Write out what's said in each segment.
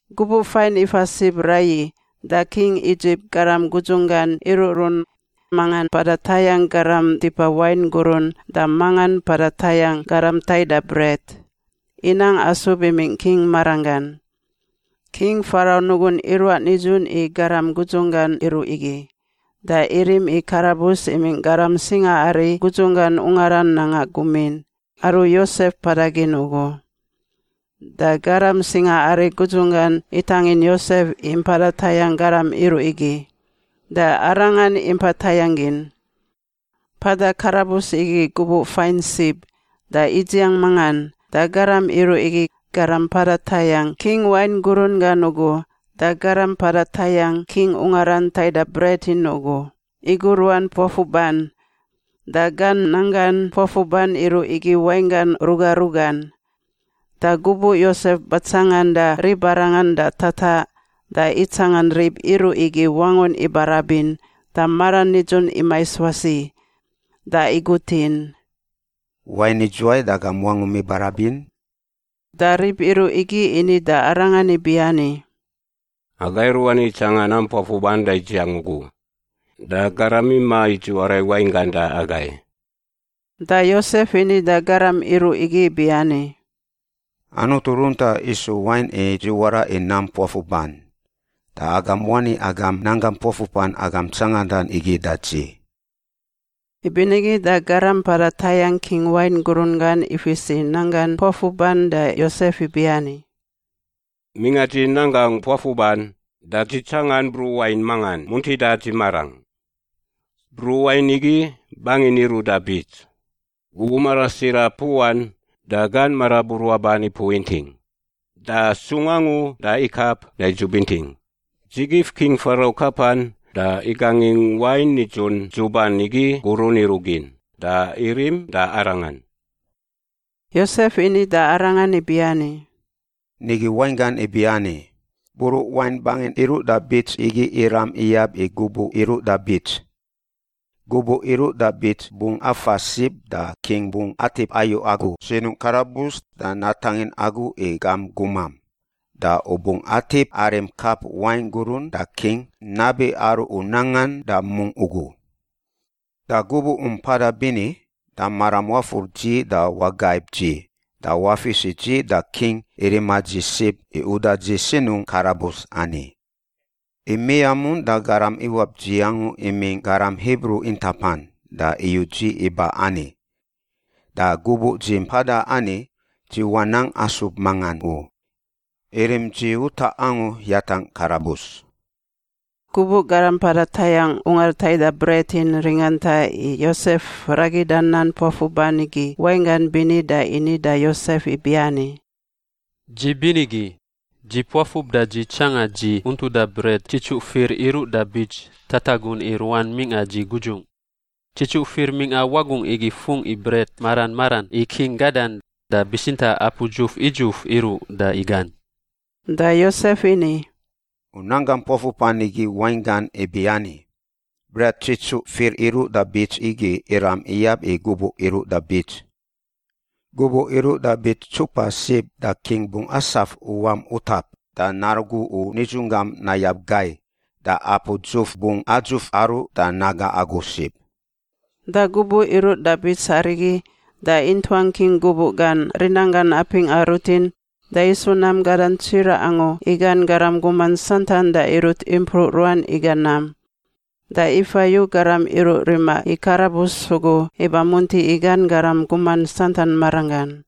Gubuꞌ fain ifa sib raiyi da king Idzip garam gudzunggan iruꞌrun, mangan mpada tayangꞌ garam tipa wain gurun da mangan mpada tayangꞌ garam taida bret, inang asub imingꞌ king maranggan. King Farau nugun iruaꞌ nidzun i garam gudzunggan iruꞌ igi, da irim i karabus imingꞌ garam singaari gudzunggan ungaran nanga gumin, aru Yosef mpada gin ugu. Da garam singaari gudzunggan itangin Yosef i mpada tayangꞌ garam iruꞌ igi, da arangan impa tayangꞌ gin. Mpada karabus igi gubuꞌ fain sib da idziang mangan, da garam iruꞌ igi— garam mpada tayangꞌ king wain gurun gan ugu da garam mpada tayangꞌ king ungaran taida bret in ugu— iguruan puafuban. Da gan nanggan puafuban iruꞌ igi wainggan ruga rugan. Da gubuꞌ Yosef batsanganda ribarangan da tataꞌ, da itsangan rib iruꞌ igi wangun ibarabin da maran nidzun imais wasi. Da igutin, “Wain idzuwai da agam wangum ibarabin?” Da rib iruꞌ igi ini da arangan ibiani, “Aga iruꞌ ani itsangan nam puafuban da idziang ugu. Da garam imaꞌ i dziwara i wainggan da agai.” Da Yosef ini da garam iruꞌ igi ibiani, “Anutu runtaꞌ isu wain i dziwara i nam puafuban. Da agam wani agam nanggam puafuban agam tsangandan igi da dzi.” Ibinigi da garam mpada tayangꞌ king wain gurun gan ifis i nanggan puafuban da Yosef ibiani, “Mingꞌa dzi nanggangꞌ puafuban da dzi tsangan bruꞌ wain mangan muntida dzi marangꞌ. Bruꞌ wain igi bangin iruꞌ da bits. Gubuꞌ marasira puꞌan da gan maraburuaban ipuꞌ inting, da sung angu da ikap da idzub inting. Dzi gif King Farau kapan da igangingꞌ wain nidzun dzuban igi gurun iruꞌ gin da irim da arangan.” Yosef ini da arangan ibiani, “Nigi wainggan ibiani: bruꞌ wain bangin iruꞌ da bits igi iram iyab i gubuꞌ iruꞌ da bits. Gubuꞌ iruꞌ da bits bungꞌ afa sib da king bungꞌ atip ayu agu sinungꞌ karabus da natangin agu i gam gumam. Da u bungꞌ atip arim kap wain gurun da king nabi aru u nangan da mungꞌ ugu. Da gubuꞌ u mpada bini, da maram wafur dzi da wagaib dzi da wafis i dzi da king i rima dzi sib i uda dzi sinungꞌ karabus ani. I miamun da garam iwap dzi angu imingꞌ garam Hibru intapan da iyu dzi iba ani. Da gubuꞌ dzi mpada ani, dzi wanang asub mangan u. Irim dzi utaꞌ angu yatangꞌ karabus.” Gubuꞌ garam mpada tayangꞌ ungar taida bret in ringanta i Yosef ragida nam puafuban igi wainggan bini da ini da Yosef ibiani, “Dzi binigi. Dzi puafub da dzi tsanga dzi untuda bret tsitsuꞌ fir iru da bits tatagun i ruan mingꞌa dzi gudzungꞌ. Tsitsuꞌ fir mingꞌa wagungꞌ igi fungꞌ i bret mara maran i king gadan, da bitsintaꞌ apu dzuf idzuf iruꞌ da igan.” Da Yosef ini, “U nanggam puafuban igi wainggan ibiani: bret tsitsuꞌ fir iruꞌ da bits igi iram iyab i gubuꞌ iruꞌ da bits. Gubuꞌ iruꞌ da bits ntsupa sib da king bungꞌ asaf u wam utap da narugu u nidzunggam nayab gai, da apu dzuf bungꞌ adzuf aruꞌ da naga agu sib.” Da gubuꞌ iru da bits arigi da intuang king gubuꞌ gan rinanggan apingꞌa rutin da isu nam gadan tsiraꞌ angu i gan garam guman santan da irut impruꞌ ruan iga nam. Da ifa yu garam iruꞌ rima i karabus ugu iba munti i gan garam guman santan maranggan.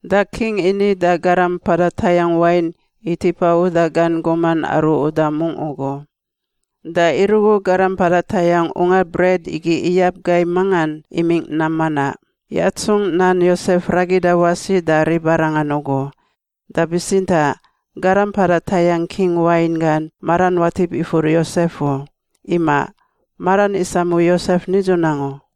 Da king ini da garam mpada tayangꞌ wain i tipa uda gan guman aru uda mungꞌ ugu, da irugu garam mpada tayangꞌ ungar bret igi iyab gai mangan imingꞌ nam manaꞌ, yatsungꞌ nan Yosef ragida wasi da ribarangan ugu. Da bitsintaꞌ garam mpada tayangꞌ king wain gan maran watip ifur Yosef u. Imaꞌ. Maran isamu Yosef nidzun angu.